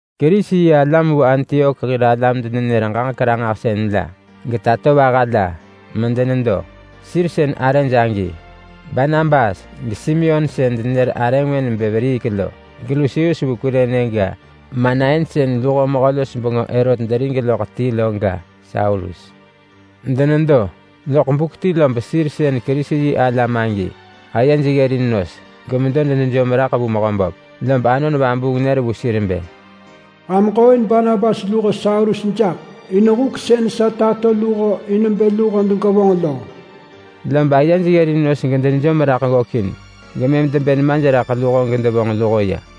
Kerisi-yi-alam vu Antiok hir alam-denenër-ġaġek-ranġahsën la, getatovaha la, medenedo. Sir sën arëj agi: Barnabas, geSimeon sën denenër arë ngwë nebë Veriik lo, geLusius vu Kurene ga, Manain sën luho mehö-los-bengö Herot derig loḳ ti lo ga, Saulus. Denedo loḳ buk ti lob sir sën Kerisi-yi-alam agi ayej ggërin nos medenedo, gemedo denejom raḳ vu Mehöböp. Lob Anon Vabuung nër vu sir bë, “Ham ġooin Barnabas luho Saulus jaḳ in huk sën sa tato luho in bë luho degevonġ lo.” Lob ayej ggërin nos gedenejom raḳ ggökin, gemëm debë nemaj raḳ luho gedevonġ luho ya.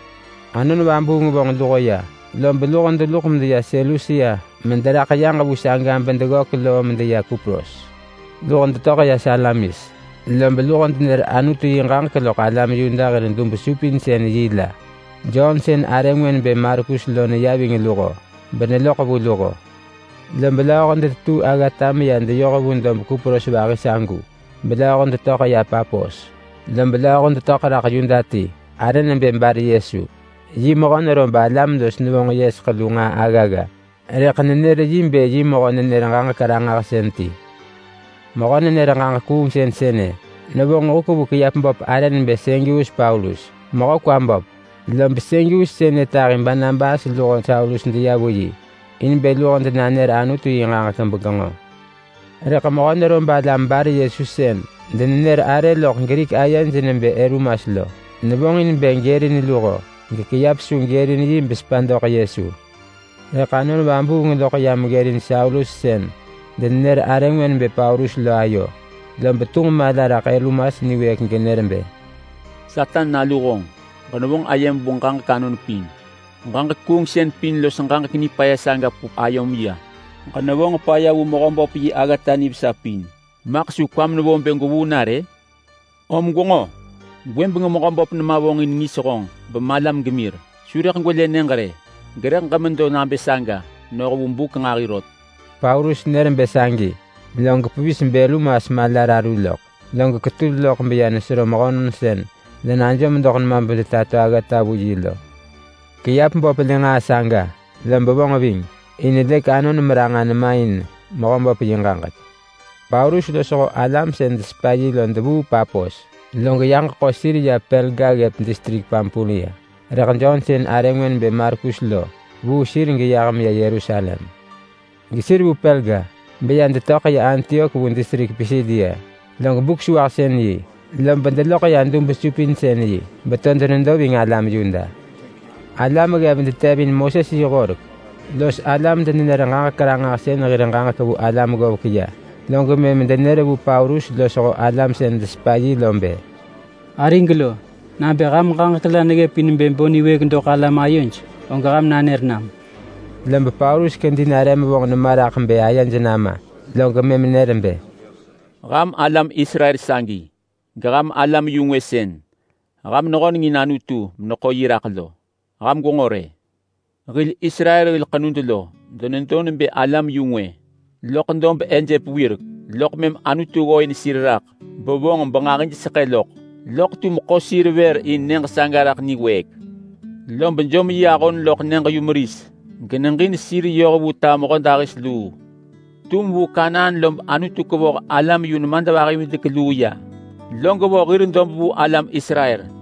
Anon Vabuung vonġ luho ya, lob luho deluḳ medeya Selusia mederaḳ yaġ vu saga bedeggök loo medeya Kupros. Luho detöḳ ya Salamis, lob luho denër Anutu yi ġaġek loḳ alam Yuda hir dub-supinsën-yi la. Jon sën arë ngwë nebë Markus lo neya ving luho beneloḳ vu luho. Lob lööho detetuu aggata medeya deyoh vu dob Kupros vahi sagu, belööho detöḳ ya Papos. Lob lööho detöḳ raḳ Yuda ti arë nebë Bar-Yesu. Yi mehö nerob alam los nevonġ yeseḳ lu nġaa aggagga, rëḳ nenër yi bë yi mehö-nenër-ġaġek-ranġahsën ti. Mehö-nenër-ġaġek-kuungsën sënë nevonġ huk vu kiap böp arë nebë Sergius Paulus, mehö kwa böp. Lob Sergius sënë tahi Barnabas luho Saulus deya vu yi in bë luho denanër Anutu yi ġaġek begenġo. Rëḳ mehö nerob alam Bar-Yesu sën denenër arë loḳ Grik ayej nebë Elumas lo, nevonġ in bë gërin luho gekiap su gërin yi besepa doḳ Yesu. Rëḳ Anon Vabuung loḳ ya meggërin Saulus sën denenër arë ngwë nebë Paulus lo ayo, lob tunġ mala raḳ Elumas niwëëk genër bë, “Satan nalu honġ! Ġenevonġ ayem vu ġaġek anon pin! Ġaġek kuungsën pin los ġaġek nipaya saga pup ayom ya! Ġenevonġ paya vu Mehöböp yi aggata nivesa pin! Maḳ su kwam nevo bë gwevuu na rë? Om gwenġo! Gwëbeng Mehöböp nema vonġin ngis honġ bemalam gemir. Su rëḳ gwelë nyëġ rë gerëḳ ġemedo nabë saga noh vu buk nġahi rot!” Paulus nër bë sagi, log pevis bElumas mala raru loḳ, log ketul loḳ beya nesero mehönon sën denajom doḳ nema bedetato aggata vu yi lo. Kiap böp lë nġaa saga, lob vonġ ving. In lëk anon meranġa nema in Mehöböp yi ġaġek. Paulus losho alam sën desepa yi lo devuu Papos, log yaġ ḳo sir ya Perga ggëp distrik Pampulia, rëḳ Jon sën arë ngwë nebë Markus lo vuu sir geyah meya Yerusalem. Gesir vu Perga beya detöḳ ya Antiok vu distrik Pisidia. Log Buk-sewahsën-yi lob deloḳ ya dub-supinsën-yi beto denedo ving alam Yuda. Alam ggev detevin Moses yi horek los alam-denenër-ġaġek-ranġahsën hir ġaġek vu alam ggovek ya, log mëm denër vu Paulus losho alam sën desepa yi lo bë, “Arig lo, nabë ham ġaġek la neggëp in bë bo niwëëk doḳ alam ayoj, og ham nanër nam.” Lob Paulus kedi nare mevonġ nema raḳ bë ayej nama, log mëm nër bë, “Ham alam Israel sagi, geham alam-yu-ngwë sën ham nehöneng in Anutu meneḳo yi raḳ lo, ham gwenġo rë! Hil Israel hil ḳenud lo denedo nebë alam-yu-ngwë loḳ dob Ejep wirek, loḳ mëm Anutu ggooin sir raḳ bevonġ benġahijseḳë loḳ, loḳ tum ḳo sir vër in nyëġ saga raḳ niwëëk. Lob jom yi ahon loḳ nyëġ-yumeris geneġin sir yoh vu ta mehödahis luu. Tum vu Kanaan lob Anutu kevoh alam yu nemadvahi-bevidek-luu ya, log vo hir dob vu alam Israel.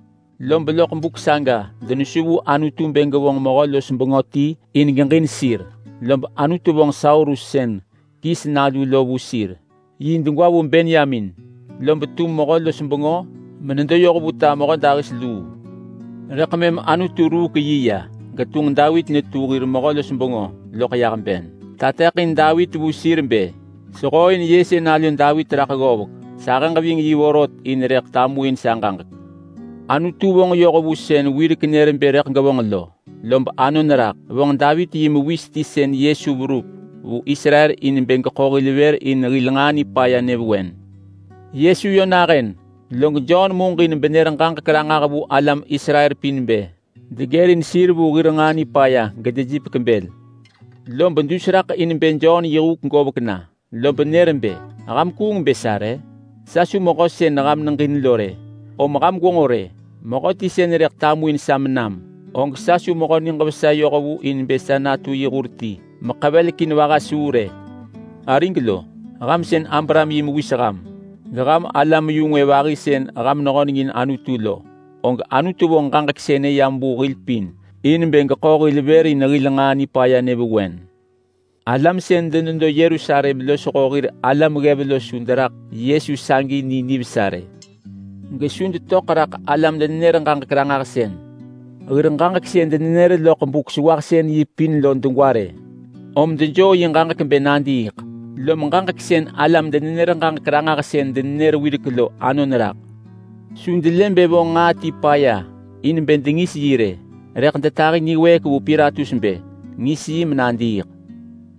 Lob vu buk saga denesu vu Anutu bë gevonġ mehö-los-bengö ti in geġin sir, lob Anutu vonġ Saulus sën Kis nalu lo vu sir. Yi degwa vu Benyamin, lob tu mehö-los-bengö menedo yoh vu ta mehödahis luu. Rëḳ mëm Anutu ruuk yi ya getunġ Davit netu hir mehö-los-bengö loḳ yah ben. Tateḳin Davit vu sir bë, ‘Sehooin Yese nalu Davit raḳ ggovek. Sahëġ ving yi vorot, in rëḳ tamuin sa ġaġek.’ Anutu vonġ yoh vu sën nër wirek bë rëḳ gevonġ lo, lob anon raḳ. Vonġ Davit yi mewis ti sën Yesu verup vu Israel in bë geḳo hil vër in hil nġaa nipaya nyëvewen. Yesu yö nahën, log Jon muġin benër ġaġek ranġah vu alam Israel pin bë degërin sir vu hir nġaa nipaya gedejipek bël. Lob dus raḳ in bë Jon yi huk govek na, lob nër bë, ‘Ham kuung bë sa re? Sa su mehö sën ham neġin lo rë. Om ham gwenġo rë! Mehöti sën rëḳ tamuin sa menam, og sa su mehö niġ vesa yohvu in bë sa natu yi hur ti meḳevelekin vaha suu rë.’ Arig lo, ham sën Abraham yi mewis ham, geham alam-yu-ngwë vahi sën ham nehöneng in Anutu lo, og Anutu vonġ ġaġek sënë yam vu hil pin in bë geḳo hil vër in hil nġaa nipaya nyëvewen. Alam sën denedo Yerusalem losho hir alam ggev lo su deraḳ Yesu sagi ni nivesa rë, gesu detöḳ raḳ alam-denenër-ġaġek-ranġahsën hir ġaġek sën denenër loḳ Buk-sewahsën-yi pin lo degwa rë. Om dejoo yi ġaġek bë nadiiḳ, lom ġaġek sën alam-denenër-ġaġek-ranġahsën denenër wirek lo anon raḳ. Su delë bë vonġ nġaa ti paya in bë dengis yi rë, rëḳ detahi niwëëk vu Pilatus bë ngis yi menadiiḳ.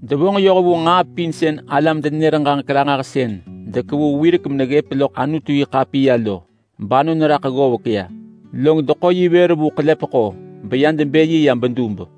Devonġ yoh vu nġaa pin sën alam-denenër-ġaġek-ranġahsën dekevu wirek meneggëp loḳ Anutu-yi-ḳapiya lo, banon raḳ ggovek ya. Log deḳo yi vër vu ḳelepeḳo beya debë yi ya bedub.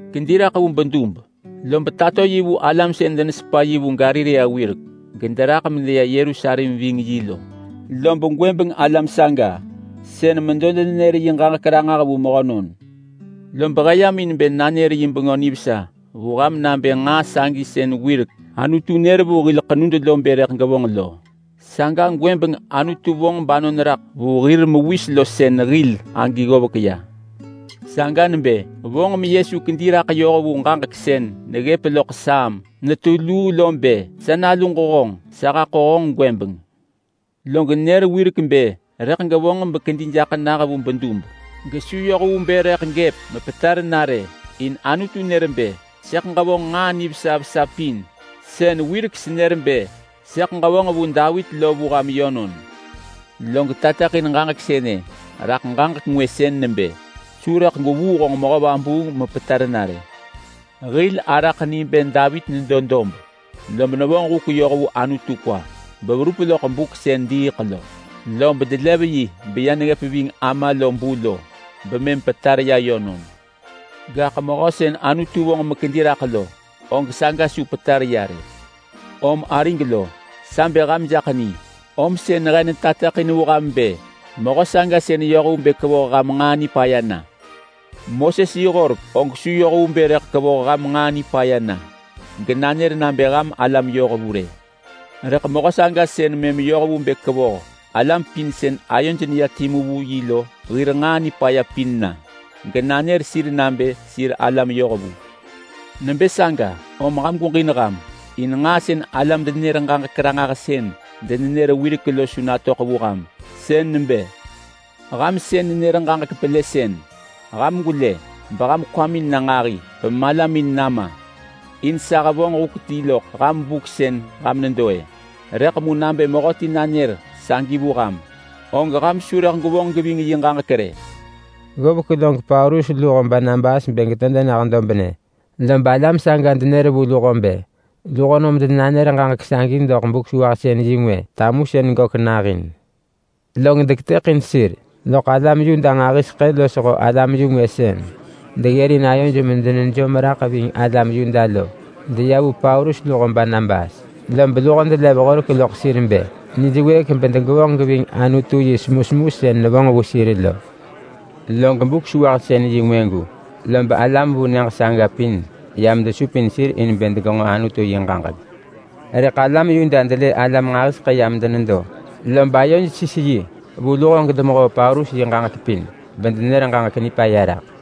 Kedi raḳ vu bedub, lob tato yi vu alam sën denesepa yi vu Galilea wirek gederaḳ medeya Yerusalem ving yi lo. Lob gwëbeng alam saga sën medo denenër yi ġaġek ranġah vu mehönon. Lob he yam in bë nanër yi Bengö Nivesa vu ham nabë nġaa sagi sën wirek Anutu nër vu hil ḳenud lo bë rëḳ gevonġ lo, saga gwëbeng Anutu vonġ banon raḳ vu hir mewis lo sën hil agi ggovek ya. Saga nebë vonġ meYesu kedi raḳ yoh vu ġaġek sën neggëp loḳ Saam netu luu lo bë: ‘Sa naluġ honġ. Sa haḳo honġ gwëbeng!’ Log nër wirek bë rëḳ gevonġ bekedi jaḳ nah vu bedub, gesu yoh vu bë rëḳ gëp mepetar na rë, in Anutu nër bë: ‘Sëḳ ġevonġ nġaa nivesa vesa pin sën wirek senër bë sëḳ ġevonġ vu Davit lo vu ham yönon.’ Log tateḳin ġaġek sënë raḳ ġaġek ngwë sën nebë: ‘Su rëḳ gwevuu honġ mehö vabuung mepetar na rë.’ Hil araḳ ni bë Davit nedo dob, lob nevonġ huk yoh vu Anutu kwa beverup loḳ buk sën diiḳ lo. Lob delev yi beya neggëp ving ama lo bu lo bemëm petar ya yönon. Gaḳ mehö sën Anutu vonġ mekedi raḳ lo, og saga su petar ya rë. Om arig lo, sa bë ham jaḳ ni, om sën he nanër ġaġek ranġah vu ham bë: Mehö saga sën yoh vu bë kevoh ham nġaa nipaya na. Moses yi horek og su yoh vu bë rëḳ kevoh ham nġaa nipaya na genanër nabë ham alam yohvu rë. Rëḳ mehö saga sën mëm yoh vu bë kevoh alam pin sën ayoj na timu vu yi lo hir nġaa nipaya pin na, genanër sir nabë sir alam yohvu. Nebë saga, om ham gweġin ham! In nġaa sën alam-denenër-ġaġek-ranġahsën denenër wirek lo su natöḳ vu ham. Sën nebë: ‘Ham sën nenër ġaġek pelësën, ham gwelë! Ham kwamin na nġahi, beham malamin nama! In sa hevonġ huk ti loḳ ham buk sën ham nedo-ë, rëḳ mu nabë mehöti nanër sagi vu ham, og ham su rëḳ gwevonġ geving yi ġaġek rë!’” Ggovek log Paulus luho Barnabas bë geto denah dobnë, lob alam saga denër vu luho bë luho nom denanër ġaġek sagi doḳ Buk-sewahsën-yi ngwë tamusën gök nahin. Log deketëḳin sir, loḳ alam Yuda nġahiseḳë losho alam-yu-ngwë sën deggërin ayoj medenejom raḳ ving alam Yuda lo deya vu Paulus luho Barnabas, lob luho delev horek loḳ sir bë nij wëëk bedegevonġ geving Anutu yi semusemu sën nevonġ vu sir lo. Log Buk-sewahsën-yi ngwëgu, lob alam vu nyëġ saga pin yam desupin sir in bë degenġo Anutu yi ġaġek. Rëḳ alam Yuda delë alam nġahiseḳë yam denedo, lob ayoj sis yi vu luho gedemehoo Paulus yi ġaġek pin bedenër ġaġek nipaya raḳ.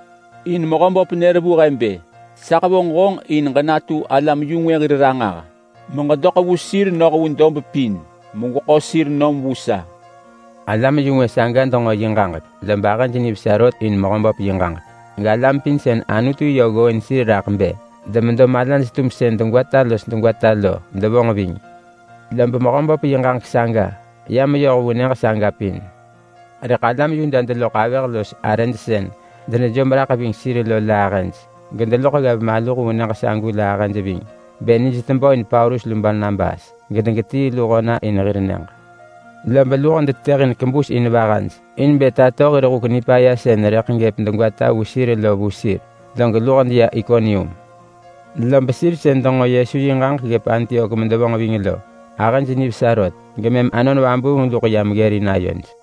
In Mehöböp nër vu he bë: ‘Sa hevonġ honġ in ġenatu alam-yu-ngwë hir ranġah, meġedoḳ vu sir noh vu dob pin megweḳo sir nom vu sa.’” Alam-yu-ngwë saga denġo yi ġaġek, lob ahëj nivesa rot in Mehöböp yi ġaġek, galam pin sën Anutu yö ggooin sir raḳ bë demedo malaj-tumsën degwata los degwata lo devonġ ving. Lob Mehöböp yi ġaġek saga ya meyoh vu nyëġ saga pin. Rëḳ alam Yuda deloḳ avëh los arëj sën denejom raḳ ving sir lo la ahëj, gedeloḳ ggev maluh vu nyëġ sagu la ahëj ving bë nij tebö in Paulus lu Barnabas gedegetii luho na in hir nyëġ. Lob luho detetëhin kebus in vahaj in bë tato hir huk nipaya sën rëḳ gëp degwata vu sir lo vu sir, log luho deya Ikonium. Lob sir sën denġo Yesu yi ġaġek ggëp Antiok medevonġ ving lo, ahëj nivesa rot gemëm Anon Vabuung luḳ yam ggërin ayoj.